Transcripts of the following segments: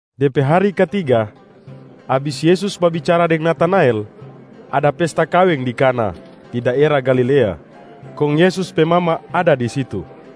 De pe hari katiga, abis Yesus babicara deng Natanael, ada pesta kaweng di Kana di daera Galilea, kong Yesus pe mama ada di situ.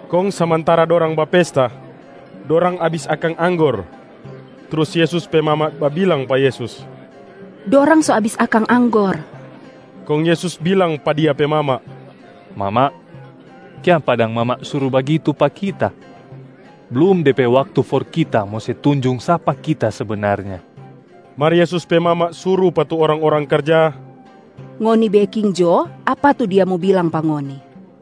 Kong samantara dorang bapesta, dorang abis akang anggor. Trus Yesus pe mama babilang pa Yesus, “Dorang so abis akang anggor.” Kong Yesus bilang pa Dia pe mama, “Mama, kiapa dang mama suru bagitu pa Kita? Blum de pe waktu for Kita mo se tunjung sapa Kita sebenarnya.” Mar Yesus pe mama suru pa tu orang-orang karja, “Ngoni beking jo apa tu Dia mo bilang pa ngoni.”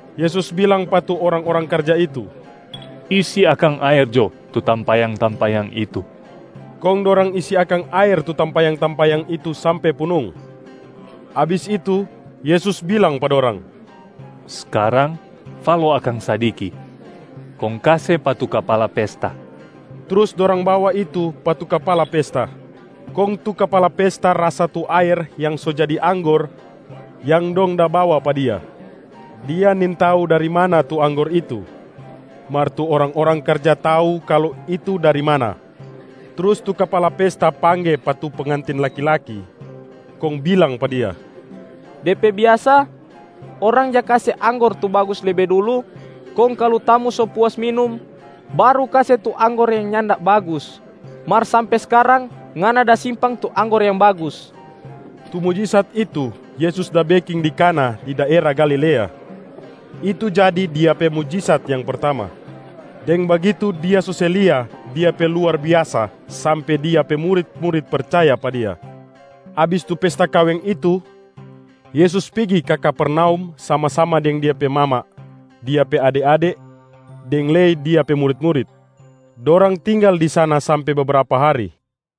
Yesus bilang pa tu orang-orang karja itu, “Isi akang aer jo tu tampayang-tampayang itu.” Kong dorang isi akang aer tu tampayang-tampayang itu sampe punung. Abis itu, Yesus bilang pa dorang, “Skarang falo akang sadiki, kong kase pa tu kapala pesta.” Trus dorang bawa itu pa tu kapala pesta. Kong tu kapala pesta rasa tu aer yang so jadi anggor yang dong da bawa pa dia. Dia nintau dari mana tu anggor itu, mar tu orang-orang karja tau kalu itu dari mana. Trus tu kapala pesta pangge pa tu pengantin laki-laki, kong bilang pa dia, “De pe biasa, orang ja kase anggor tu bagus lebe dulu kong kalu tamu so puas minum, baru kase tu anggor yang nyanda bagus. Mar sampe skarang ngana da simpang tu anggor yang bagus.” Tu mujisat itu Yesus da beking di Kana di daera Galilea. Itu jadi Dia pe mujisat yang pertama. Deng bagitu Dia so se lia Dia pe luar biasa sampe Dia pe murit-murit percaya pa Dia. Abis tu pesta kaweng itu, Yesus pigi ka Kapernaum sama-sama deng Dia pe mama, Dia pe ade-ade deng lei Dia pe murit-murit. Dorang tinggal di sana sampe bebrapa hari.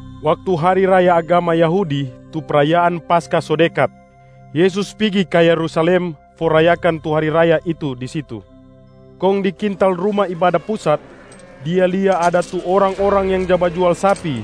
Waktu hari raya agama Yahudi tu prayaan Paskah so dekat, Yesus pigi ka Yerusalem for rayakan tu hari raya itu di situ. Kong di kintal Ruma Ibada Pusat, Dia lia ada tu orang-orang yang ja bajual sapi,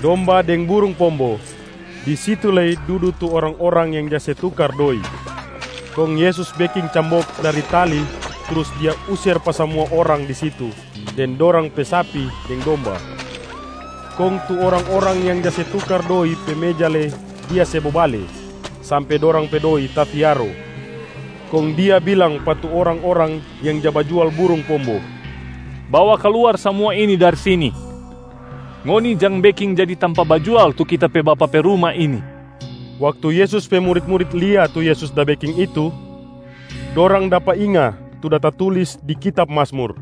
domba deng burung pombo, di situ lei dudu tu orang-orang yang ja se tukar doi. Kong Yesus beking cambok dari tali trus Dia user pa samua orang di situ deng dorang pe sapi deng domba. Kong tu orang-orang yang ja se tukar doi pe meja lei Dia se bobale sampe dorang pe doi tafiaro. Kong Dia bilang pa tu orang-orang yang ja bajual burung pombo, “Bawa kaluar samua ini dari sini. Ngoni jang beking jadi tampa bajual tu Kita pe Bapa pe ruma ini.” Waktu Yesus pe murit-murit lia tu Yesus da beking itu, dorang dapa inga tu da tatulis di kitab Mazmur,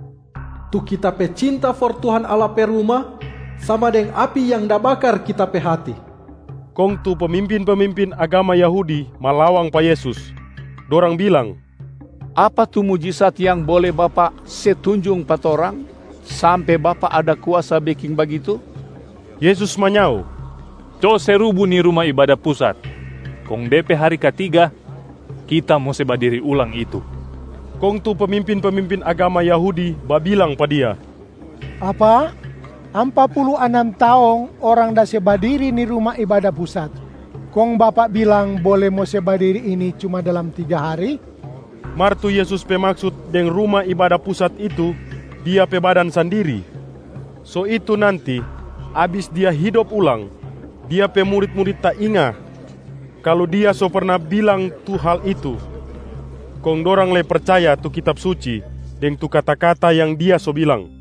“Tu Kita pe cinta for Tuhan Allah pe ruma sama deng api yang da bakar Kita pe hati.” Kong tu pemimpin-pemimpin agama Yahudi malawang pa Yesus. Dorang bilang, “Apa tu mujisat yang bole Bapak se tunjung pa torang, sampe Bapak ada kuasa beking bagitu?” Yesus manyao, “Co se rubu ni Ruma Ibada Pusat, kong de pe hari katiga Kita mo se badiri ulang itu.” Kong tu pemimpin-pemimpin agama Yahudi babilang pa Dia, “Apa? Ampa pulu anam taong orang da se badiri ni Ruma Ibada Pusat, kong Bapak bilang bole mo se badiri ini cuma dalam tiga hari?” Mar tu Yesus pe maksut deng Ruma Ibada Pusat itu, Dia pe badan sandiri. So itu nanti, abis Dia hidop ulang, Dia pe murit-murit tainga kalu Dia so perna bilang tu hal itu, kong dorang lei percaya tu Kitab Suci deng tu kata-kata yang Dia so bilang.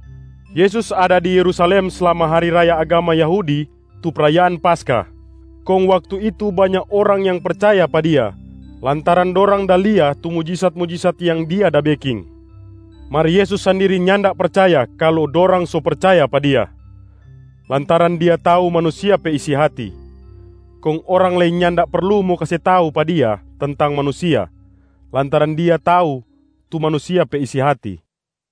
Yesus ada di Yerusalem slama hari raya agama Yahudi tu prayaan Paskah, kong waktu itu banya orang yang percaya pa Dia lantaran dorang da lia tu mujisat-mujisat yang Dia da beking. Mar Yesus sandiri nyanda percaya kalu dorang so percaya pa Dia, lantaran Dia tau manusia pe isi hati. Kong orang lei nyanda perlu mo kase tau pa Dia tentang manusia, lantaran Dia tau tu manusia pe isi hati.